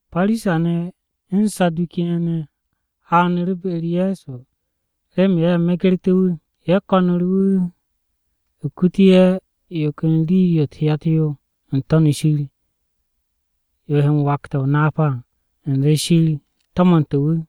Parisa-ne̱ u̱n Saduki-ne̱ haaru̱ be-u̱r Ye̱so remen ye̱ megerté̱ wu̱, ye̱ ko̱nu̱ru̱ wu̱ kutu̱ ye̱ yo ken rii-yo u̱t-hyat yo n-To̱n shir, yo he m-wakte̱ o-napa à u̱nze Shir wu̱ to̱mne̱ wu̱.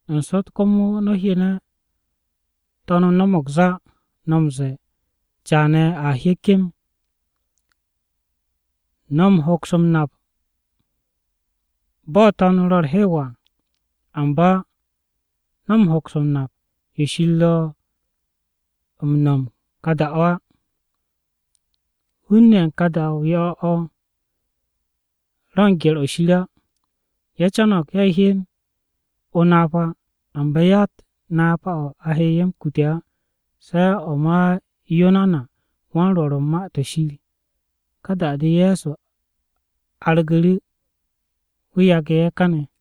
N-sot komo, no̱ hyene̱ To̱n-o no̱mo̱g zá, no̱ m-ze̱e̱, ‘Caane̱ a hye kem.’ No̱ m-hoks m-nap bo̱ To̱n-o ro̱ u̱r-hew à, amba no̱ hoks o-napa yo Shir ro̱ m-no̱m u̱n ka da-o á. Hun-ne̱ ye̱ u̱n ka da-o yo̱-o̱ o̱ ro̱ u̱n gye̱r-o̱ Shir á. Ye̱ co̱no̱g ye̱ hyen o-napa amba yatt napa-o̱ a he ye̱ m-kute̱ á, se̱ o̱ ma Yunanawan-Rwo̱r u̱n Ma-to̱ Shir.” Ka da-de Ye̱so argu̱ru̱, wu̱ yage̱ ye̱ káne̱.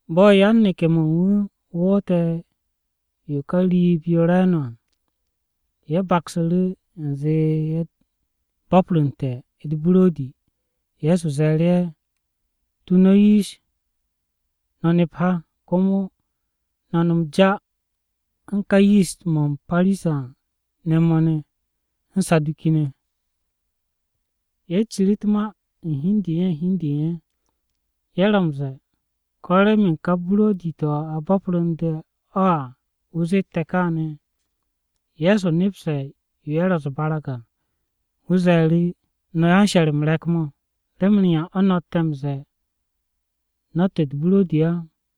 Bo̱ yan-neke̱-mo̱ u̱n wu̱ woote̱ yo ka riib-yo re̱e̱no̱ à, ye̱ baksu̱ru̱ u̱nze ye̱ bo̱pru̱nte̱ u̱t-buro̱di. Ye̱so ze̱e̱ru̱ ye̱, “Tu no̱ yish no̱ nep ha, komo no̱ nom ja u̱n ká yist-mo̱ u̱n Parisa-ne̱ mo̱ ne̱ u̱n mo̱ u̱n Saduki-ne̱.” Ye̱ ciri u̱t-ma u̱n hi u̱n de u̱n ye̱ u̱n hi u̱n de u̱n ye̱. Ye̱ ro̱ m-ze̱e̱, “¿Ko̱ remen ka buro̱di-to̱ a bo̱pru̱nde̱ à o̱ wu̱ zette̱ káane̱?” Ye̱so nepse̱ yo ye̱ ro̱ u̱s-barag à, wu̱ ze̱e̱ru̱, “No̱ yan-she̱r-m re̱k-mo̱! ¿Remen yan o̱ no̱tte̱ m-ze̱e̱ no̱tt u̱t-buro̱di á?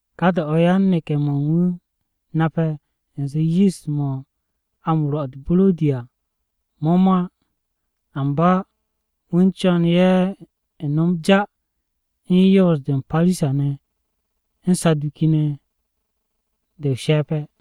Ka da-o̱ yan-neke̱-mo̱ u̱n wu̱ nape̱ u̱nze yist-mo̱ a m-rwo̱ u̱t-buro̱di à mo̱ mo̱ á, amba wu̱ u̱n co̱n ye̱ no̱m ja u̱n yoos-de u̱n Parisa-ne̱ u̱n Saduki-ne̱ de o-she̱pe̱.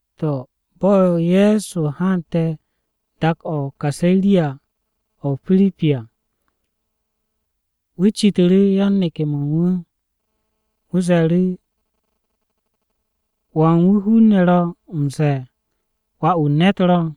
To̱, bo̱ Ye̱so haante̱ dak-o̱ o-Kaseriya o̱ o-Pirip à, wu̱ citu̱ru̱ yan-neke̱-mo̱ u̱n wu̱. Wu̱ ze̱e̱ru̱, “¿Wan wu̱ hun-ne̱ ro̱ m-ze̱e̱ Wà-wu̱ u̱n ne̱t ro̱?”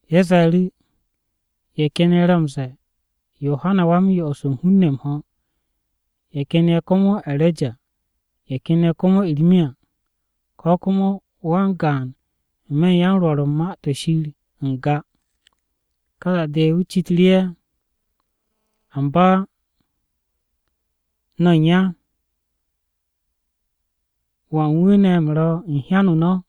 Ye̱ ze̱e̱ru̱, “Ye̱ ken ye̱ ro̱ m-ze̱e̱ Yohana Wa-m-Yo'os u̱n hun-ne̱ m-ho̱, ye̱ ken ye̱ komo E̱reja, ye̱ ken komo Irmiya, ko̱ komo wan-gaan n-me̱ u̱n yan-Rwo̱r u̱n Ma-to̱ Shir n-ga.” Ka da-de wu̱ citu̱ru̱ ye̱, “¿Amba no̱ u̱n ya, wan wu̱ ne̱ u̱m ro̱ u̱n hyan-o no̱?”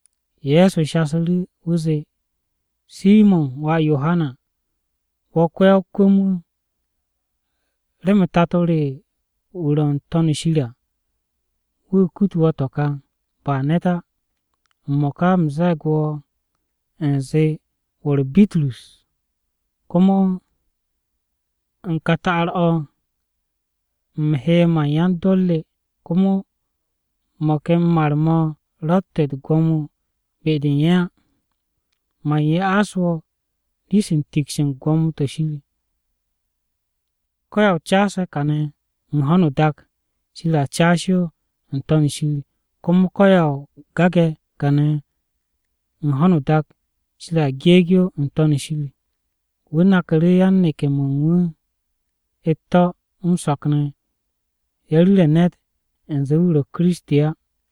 Ye̱so shasu̱ru̱, wu̱ zee, “Simo̱n wà Yohana, wo̱ ko-ya-o-kwu̱m-wu̱! Remen Tato re wu̱ ro̱ n-To̱n shir à, wu̱ kutu̱ wo̱ to̱ ka, ba ne̱t á. M-mo̱ka u̱m ze̱e̱g wo̱ u̱nze wo̱ ro̱ Bitrus, komo n-to̱n u̱n ka ta'ar-o̱ u̱m he man yan-dor re, komo mo̱ ken mar-mo̱ ro̱tt u̱t-gwo̱mo be-de u̱n ye̱ á. Man ya'as wo̱ rii-se u̱n tiks u̱n gwo̱mo-to̱ Shir. Ko̱yan o caase̱ kane̱ u̱n ho̱no o-dak, Shir a caas yo n-To̱n shir. Komo ko̱yan o gage̱ kane̱ u̱n ho̱no o-dak, Shir a geeg yo n-To̱n shir.” Wu̱ naku̱ru̱ yan-neke̱-mo̱ u̱n wu̱ u̱t-to̱ m-so̱k ne̱, ye̱ ru̱re̱ ne̱t u̱nze wu̱ ro̱ Kiristi á.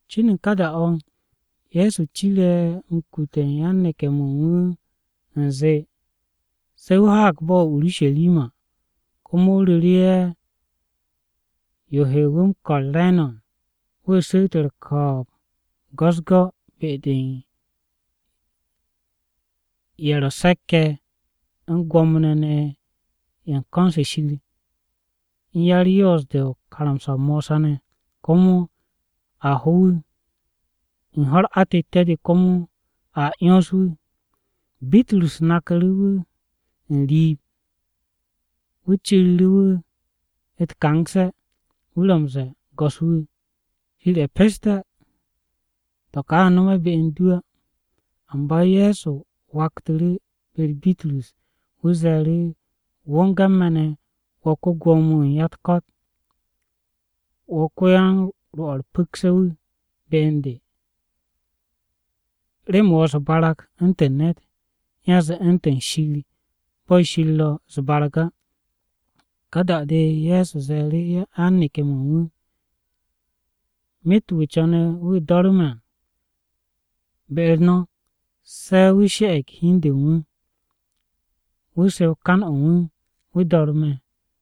Cin u̱n ká da-o̱, Ye̱so cire̱ m-kute̱ u̱n yan-neke̱-mo̱ u̱n wu̱ u̱nze, se̱ wu̱ haag bo̱-o̱ o-Urusharima. Komo wu̱ ru̱ru̱ ye̱ yo he wu̱ m-ko̱r re̱e̱no̱ à. Wu̱ su̱u̱t u̱r-ko̱o̱b go̱-u̱s-go̱ be-de u̱n ye̱ ro̱ se̱k-ye̱, u̱n Gwo̱mo-ne̱ ye̱ u̱n ko̱n-se Shir, u̱n ya-u̱r-yoos-de karamsa-o̱ Mosa ne̱. Komo a ho wu̱, u̱n ho̱-u̱r atette̱-de komo a 'yons wu̱. Bitrus naku̱ru̱ wu̱ n-riib, wu̱ ciru̱ru̱ wu̱ u̱t-kangse̱. Wu̱ ro̱ m-ze̱e̱, “Go̱s-wu̱, Shir ye̱ peste̱! To̱ ka a nome̱ be u̱n du á.” Amba Ye̱so waktu̱ru̱ be-u̱r Bitrus. Wu̱ ze̱e̱ru̱, “Wo̱nge̱ u̱n me̱ ne̱, wo̱ ko-Gwo̱mo-wu̱ u̱n ya-u̱t-ko̱t! Wo̱ ko-yan-rwo̱ u̱r-pu̱kse̱ wu̱ be u̱n de. Remen wo̱ u̱s-barag u̱ntu̱n ne̱t, yanze u̱ntu̱n Shir bo̱ Shir ro̱ u̱s-barag á.” Ka da-de Ye̱so ze̱e̱ru̱ yan-neke̱-mo̱ u̱n wu̱, “Myet wu̱ co̱ne̱ wu̱ do̱ru̱ me̱ à, be-u̱r no̱, se̱ wu̱ she̱'e̱g hi u̱n de u̱n wu̱, wu̱ sew kan-o̱ u̱n wu̱, wu̱ do̱ru̱ me̱.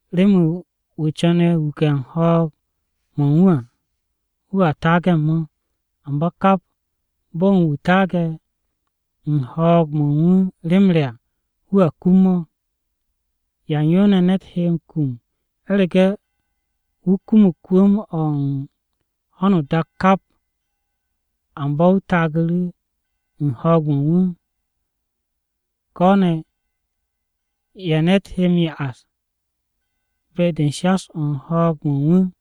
Remen wu̱ co̱ne̱ wuke̱ u̱n ho̱o̱g-mo̱ u̱n wu̱ à, wu̱a taage̱ u̱n mo̱. Amba kap bo̱n wu̱ taage̱ u̱n ho̱o̱g-mo̱ u̱n wu̱ rem re à, wu̱a kum mo̱. ¿Yan yo ne̱ ne̱t he m-kum u̱rege̱ wu̱ kumug kwu̱m-o̱ u̱n ho̱no o-dak kap, amba wu̱ taagu̱ru̱ u̱n ho̱o̱g-mo̱ u̱n wu̱? Ko̱ ne̱, ¿ya ne̱t he m-ya'as be-de u̱n shas-o̱ u̱n ho̱o̱g-mo̱ u̱n wu̱?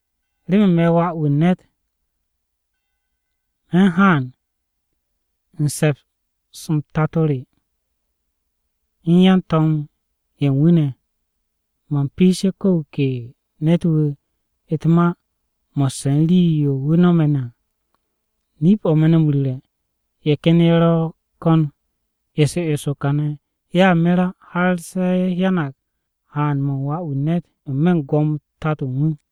Remen me̱ Wà-wu̱ u̱n ne̱t, man haan u̱n se̱ps-m Tato re ne̱ u̱n yan-to̱m-ye̱ u̱n wu̱ ne̱, man piishe̱ ko̱ wu̱ ke ne̱t-wu̱ u̱t-ma mo̱sse̱ u̱n rii-yo wu̱ no̱me̱ ne̱ à. Nip-o̱ me̱ no̱ m-ru̱re̱, ye̱ ken ye̱ ro̱ ko̱n eso eso kane̱ ye̱a mer á, har se̱ ye̱ hyanag haan-mo̱ u̱n Wà-wu̱ u̱n ne̱t n-me̱ u̱n gwo̱mo-u̱t Tato u̱n wu̱.”